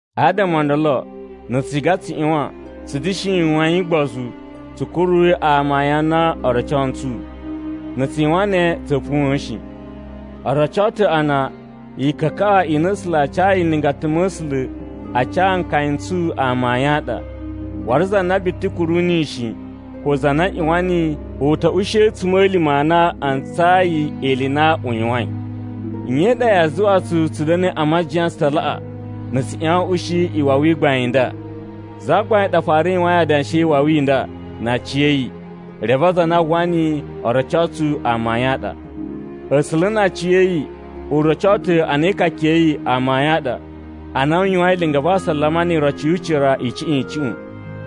Adama o ndolo na̱ tsu ciga tsu ꞌyuwan tsu da̱shi yuwain ugbozu tsu kuruyi amayun a na o roco ntsu. Na̱ tsu yuwan ne tsa̱a̱ puwa̱a̱n shi. O roco ta̱ a na ikakaꞌa i na A̱sula̱ a cayi nlingata ma̱ A̱sula̱ a ca nkaya n tsu amayun a ɗa. Waru za na biti kuru niyi shi, ko za na ꞌyuwan niyi u ta̱ ushi a̱tsuma̱lima̱ a na a ntsayi ili i na u yuwain. Nye i ɗa yaa zuwa tsu tsu da̱na̱i a majiyan tsu ta laꞌa na̱ tsu ꞌyuwan a̱ ushi iwawi i gbain i nda? Zagbain ɗa fara yuwain adanshi e iwawi i nda na aciya̱yi, reve aza a na a uwwa niyi o roco tsu amayun a ɗa. A̱sula̱ na aciya̱yi u roco ta̱ a na ikaka ya̱ yi amayun a ɗa, ana u yuwain linga va asalama ni iroci yu ucira icuꞌun icuꞌun.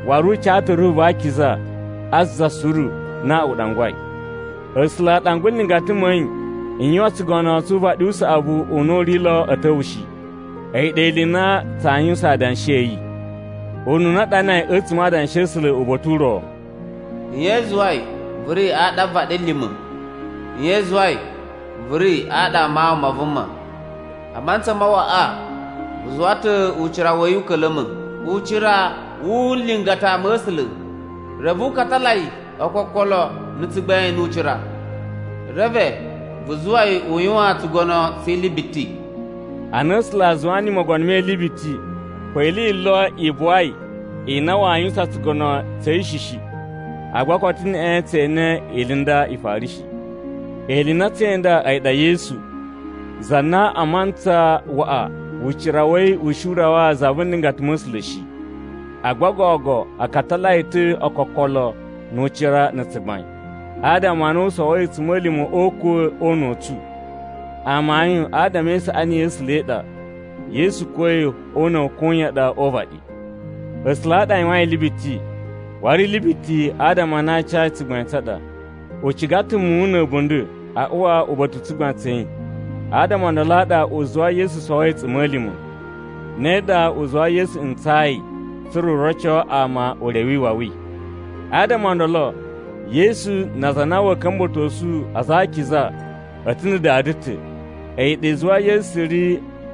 Waru u ca ta̱ Ruhu va Akiza a za suru na u ɗangwai. A̱sula̱ a ɗangwa nlingata ma̱ yi n yuwan tsugono tsu uvaɗi u saꞌavu u na u ri lo a̱ ta̱wa̱ shi, a̱yi ɗa ili i na tsaa yuwusan adanshi a̱ yi. Ununa a ɗanai a̱tsuma̱ Adanshi a̱ A̱sula̱ uba̱ta̱ u ro, “Nye i zuwai vu ri aɗa a vaɗilima̱? Nye i zuwai vu ri aɗa a mawun ma vuma? A mantsa ma waꞌa vu zuwa ta̱ ucira wa̱ yi u ka̱la̱ma̱ ucira wu nlingata ma̱ A̱sula̱, reve vu katala yi ookokolo na̱ tsugbain nu ucira. Reve vu zuwa yi u yuwan tsugono tsi ili biti.” Ana A̱sula̱ a zuwa niyi mogono me ili biti, ko ili yi lo i buwai i na waa yuwusan tsugono tsa̱ yi shi shi. Agba koto neꞌen tse ene ili i nda i fara shi. Ili i na tsee inda a̱yi ɗa Yesu, za na a mantsa waꞌa ucira wa̱ yi u shi u rawa za vu nlingata ma̱ A̱sula̱ shi. Agba gogo a katala yi ta̱ ookokolo nu ucira na̱ tsugbain, adama a na u sowoi a̱tsuma̱lima̱ o ukwa̱ o una̱ u tsu. Amayun adama e isaꞌani ya̱ A̱sula̱ i ɗa, Yesu kuwa̱i o una̱ wa̱ koyan ɗa o uvaɗi. A̱sula̱ a ɗa a yuwain ili biti, waru ili biti adama a na a ca yi tsugbain tsa ɗa. U ciga ta̱ muwun na̱ a̱bunda̱ a uwa uba̱ta̱ u tsugbain tsa̱ yi. Adama o ndolo a ɗa u zuwai Yesu sowoi a̱tsuma̱lima̱, ne ɗa u zuwai Yesu ntsayi tsa̱ra̱ u roco ama ure wi iwawi. Adama o ndolo, Yesu na aza a na wa̱a̱ ka̱mba̱tosu aza a akiza a̱ ta̱ na̱ Dada ta̱. A̱yi ɗa i zuwai Yesu ri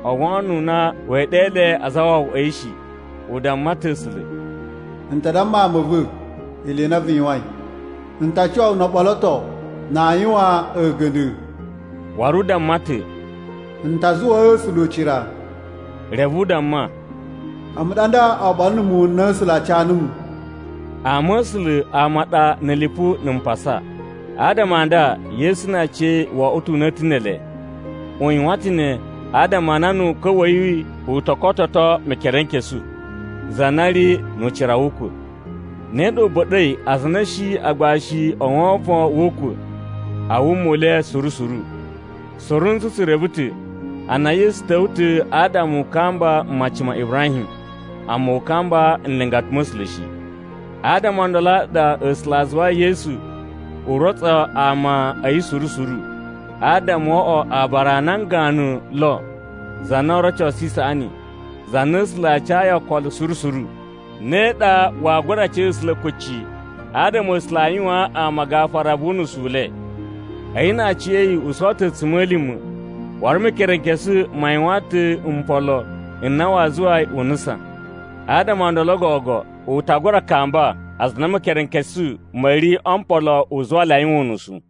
o wono u na wee ɗe le azawawaꞌa a̱ yi shi. U damma ta̱ A̱sula̱, “N ta damma ama a̱ va̱ ili i na vu yuwain. N ta cuwa wu no o ɓoloto na aa yuwan a̱ga̱nda̱.” Waru u damma ta̱, “N ta zuwaa A̱sula̱ ucira.” Reve u damma, “A̱mu ɗa nda oɓolo na̱ muwun n na A̱sula̱ a ca numu.” Ama a̱ A̱sula̱ ama a ɗa na̱ lipu na̱ mpasa, adama a nda Yesu na aciya̱yi wo oꞌwo ta̱ una̱ta̱ ne ele. U yuwan ta̱ ne adama a na nu ukwa̱ wa̱ yi u to kototo Mekerenkesu, za na ri nu ucira wu ukwa̱. Ne ɗa u ba̱ɗa̱i aza a na a̱ shi agbashi o wovon wu ukwa̱ a wuma u le suru suru. Suru ntsu tsu reve ta̱ a na Yesu ta̱wa̱ ta̱ adama u kamba mmaci ma Ibrahim, amma u kamba nlingata ma̱ A̱sula̱ shi. Adama o ndolo a ɗa A̱sula̱ a zuwai Yesu u rotso ama a̱ yi suru suru, adama wo oꞌwo aabara a nan ganu lo za na oo rocosu isaꞌani, za na A̱sula̱ a cayi okolo suru suru. Ne ɗa waa gura ca A̱sula̱ kucci adama A̱sula̱ a yuwaan ama gafura vu unusu u le. A̱yi na aciya̱yi u sowo ta̱ a̱tsuma̱lima̱, waru Mekerenkesu ma yuwan ta̱ mpolo n na waa zuwa yi u nusan. Adama o ndolo gogo u ta gura kamba aza a na Mekerenkesu ma̱ ri o mpolo u zuwa le a yuwan unusu.